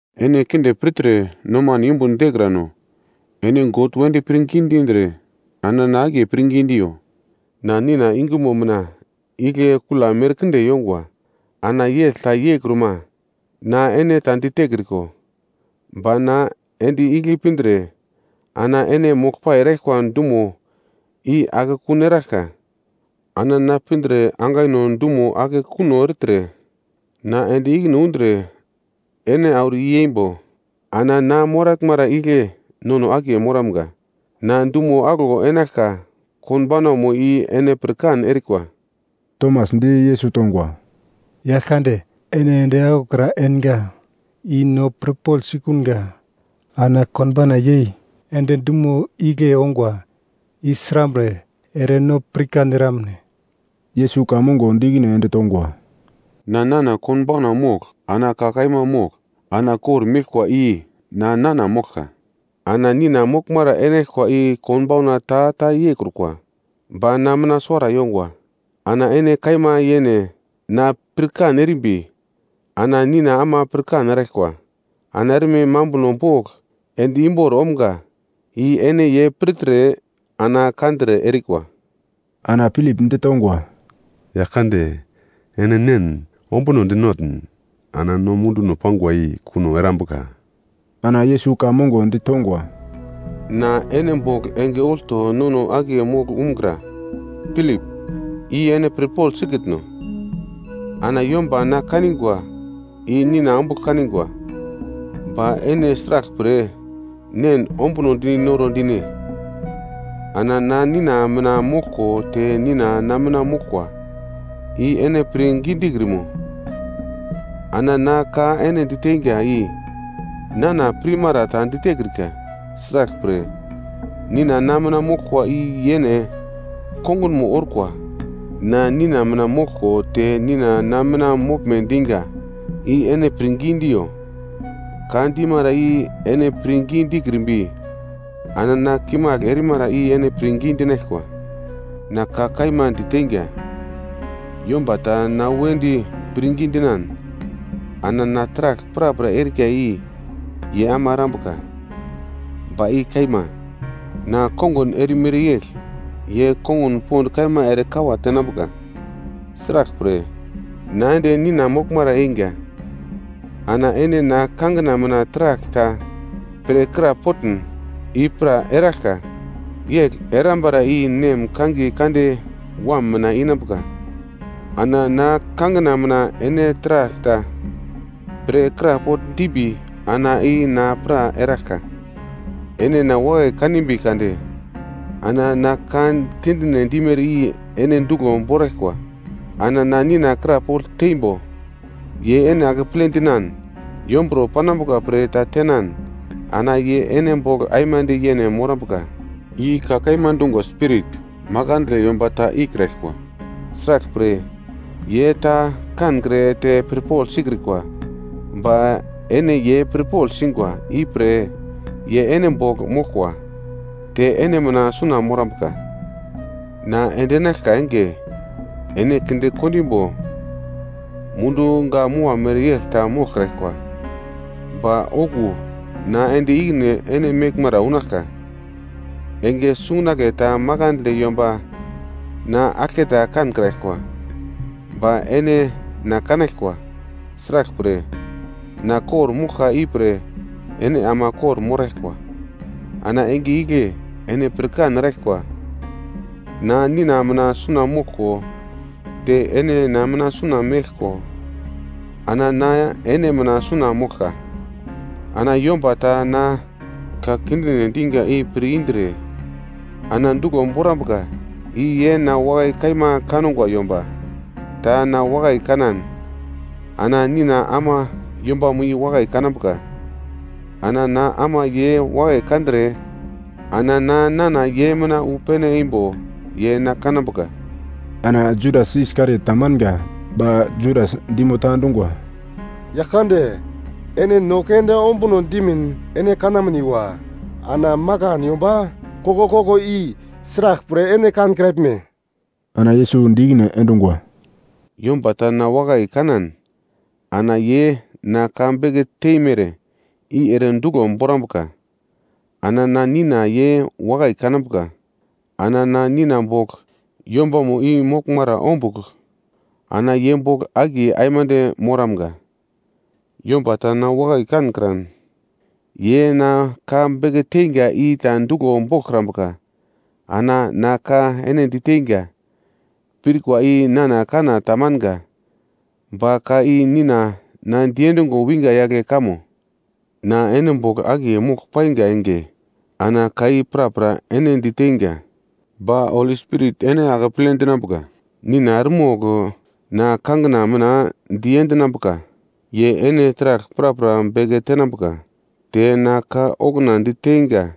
“Ene kinde pirtre nomano yumbun dekrano, ene God wedi pirngi dindre, ana na akiye pirngi diyo. Na Nina yungumo mina igle kula merkinde yongwa, ana yegl ta yeikruma, na ene ta ditekriko. Ba na ende igle pindre ana ene moglpai eraglkwa dumono i akekun eraglka. Ana na pindre angaino dumo ake kuno ertre, na ende ikine undre ene auro i-yeimbo, ana na moraglmara igle nono akiye moramga. Na dumo aglo enaglka konbaunamo i ene pirkan erikwa.” Tomas di Yesus tongwa, “Yaglkande, ene ende aglokra enga i no pirpogl sikunga. Ana konbauna yei ende dumo igle ongwa i srambre ere no pirkan eramne?” Yesus ka mongo di ikine ende tongwa, “Na nana konbauna mogl, ana ka kaima mogl, ana kor-meglkwa i na, nana moglka. Ana Nina moglmara enaglkwa i konbauna ta ta yeikrukwa. Ba na mina suwara yongwa. Ana ene kaima yene na pirkan erimbi, ana Nina ama pirkan eraglkwa. Ana erme mambuno bogl ende imbor omga i ene ye pirtre ana kandre erikwa.” Ana Pilip ditongwa, “Yaglkande, ene Nen ombunodi notn ana no munduno pangwa i kuno erambuka.” Ana Yesus ka mongo ditongwa, “Na ene bogl enge olto nono akiye mogl umgra, Pilip, i ene pirpogl sikitno? Ana yomba na kanigwa i Nina ombugl kanigwa. Ba ene sraglpre Nen ombunodi noro dine? Ana na Nina mina moglko te Nina na mina moglkwa. I ene pirngi dikrimo? Ana na ka ene diteinga i nana pirmara ta ditekrika. Sraglpre, Nina na mina moglkwa i yene kongunmo orkwa. Na Nina mina moglko te Nina na mina moglme dinga i ene pirngi diyo, ka dimara i ene pirngi dikrimbi, ana na kimagl erimara i ene pirngi dinaglkwa. Na ka kaima diteinga, yomba ta na wedi pirngi dinan, ana na taragl prapra erika i ye ama erambuka. Ba i kaima, na kongun erimere yegl ye kongun pond kaima ere kawa tenambuka. Sraglpre, na ende Nina moglmara eingwa. Ana ene na kangina mina taragl ta pre krapotn, i pra eraglka. Yegl erambara i Nem kangiye kande Wam mina inambuka. Ana na kangina mina ene taragl ta pre krapogl dimbi ana i na pra eraglka. “Ene na wakai kanimbi kade, ana na ka kindine dimere i ene duglo boraglkwa. Ana na Nina krapogl teimbo, ye ene akeple dinan yomburo panambuka pre ta tenan ana ye ene bogl aimande yene morambuka. I ka kaima dungwa Spirit, makandle yomba ta ikraglkwa. Sraglpre, ye ta kankre te pirpogl sikrikwa. Ba ene ye pirpogl singwa. Ipre ye ene bogl moglkwa, te ene mina suna morambuka. Na endinaglka enge ene kinde kondimbo mundu gak-mua mereyegl ta moglkraglkwa. Ba okuwo na ende ikine ene meglmara unaglka. Enge sungunagle ta makandle yomba na aglketa kankraglkwa. Ba ene na kanaglkwa. Sraglpre, na kor-moglka ipre ene ama kor-moraglkwa. Ana enge igle ene pirkan eraglkwa, na Nina mina suna moglko, te ene na mina suna meglko, ana na ene mina suna moglka. Ana yomba ta na ka kindine dinga i pir indre ana duglo borambuka i ye na wakai kaima kangwa. Yomba ta na wakai kanan ana Nina ama yombamo i wakai kanambuka, ana na ama ye wakai kandre ana na nana ye mina wu pene eimbo ye na kanambuka.” Ana Judas Iskariot tamanga, ba Judas dimo ta dungwa, “Yaglkande, ene no keunde ombuno dimin, ene kanamniwa, ana makan yomba koglkoglo i sraglpre ene kankraglme?” Ana Yesus di ikine endungwa, “Yomba ta na wakai kanan ana ye na ka beke teimere i ere duglo borambuka. Ana na Nina ye wakai kanambuka, ana na Nina bogl yombamo i moglmara umbuglo, ana ye bogl akiye aimande moramga. Yomba ta na wakai kankran, ye na ka beke teinga i ta duglo boglkrambuka. Ana na ka ene diteinga, pirkwa i nana kanna tamanga, ba ka i Nina na diendungo winga yagle kamo. “Na ene bogl akiye mogl painga enge ana ka i prapra ene diteinga. Ba Holi Spirit ene akeple dinambuka, Nina eremogl na kangina mina diendinambuka. Ye ene taragl prapra beke tenambuka, te na ka okuna diteinga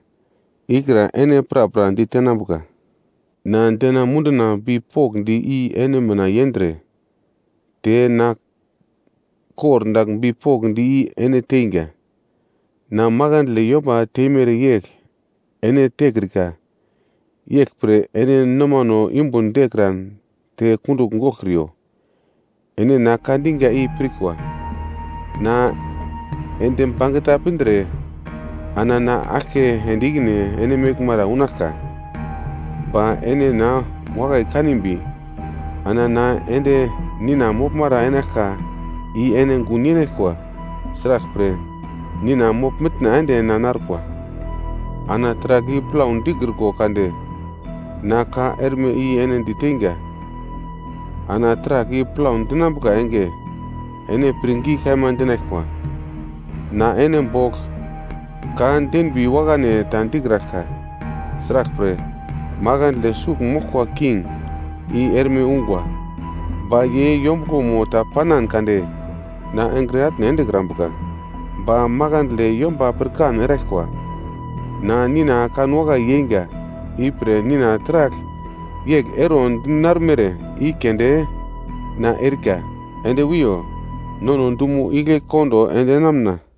ikra ene prapra ditenambuka. Na dena munduna bipokndi i ene mina yendre, te na kordagl bipokndi i ene teinga. Na makandle yomba teimere yegl ene tekrika. Yeglpre ene nomano yumbun dekran te kundugl goglkriyo. “Ene na ka dinga i pirkwa, ‘Na ende bangeta pindre ana na aglke ende ikine ene meglmara unaglka.’ Ba ene na wakai kanimbi, ana na ende Nina moglmara enaglka i ene gun yenaglkwa. Sraglpre, Nina mogl-mitna ende na narkwa. Ana taragl i plau dikriko kade na ka erme i ene diteinga, ana taragl i plau dinambuka enge ene pirngi kaima dinaglkwa. Na ene bogl ka denbi wakane ta dikraglka. Sraglpre, makandle sugl moglka king i erme ungwa. Ba ye yombuglomo ta panan kade na engre atne endekrambuka. Ba makandle yomba pirkan eraglkwa na Nina kanwakai yeinga. Ipre Nina taragl yegl ero dinarumere i keunde na erika. “Ende wiyo. Nono dumo igle kondo endinamuna.”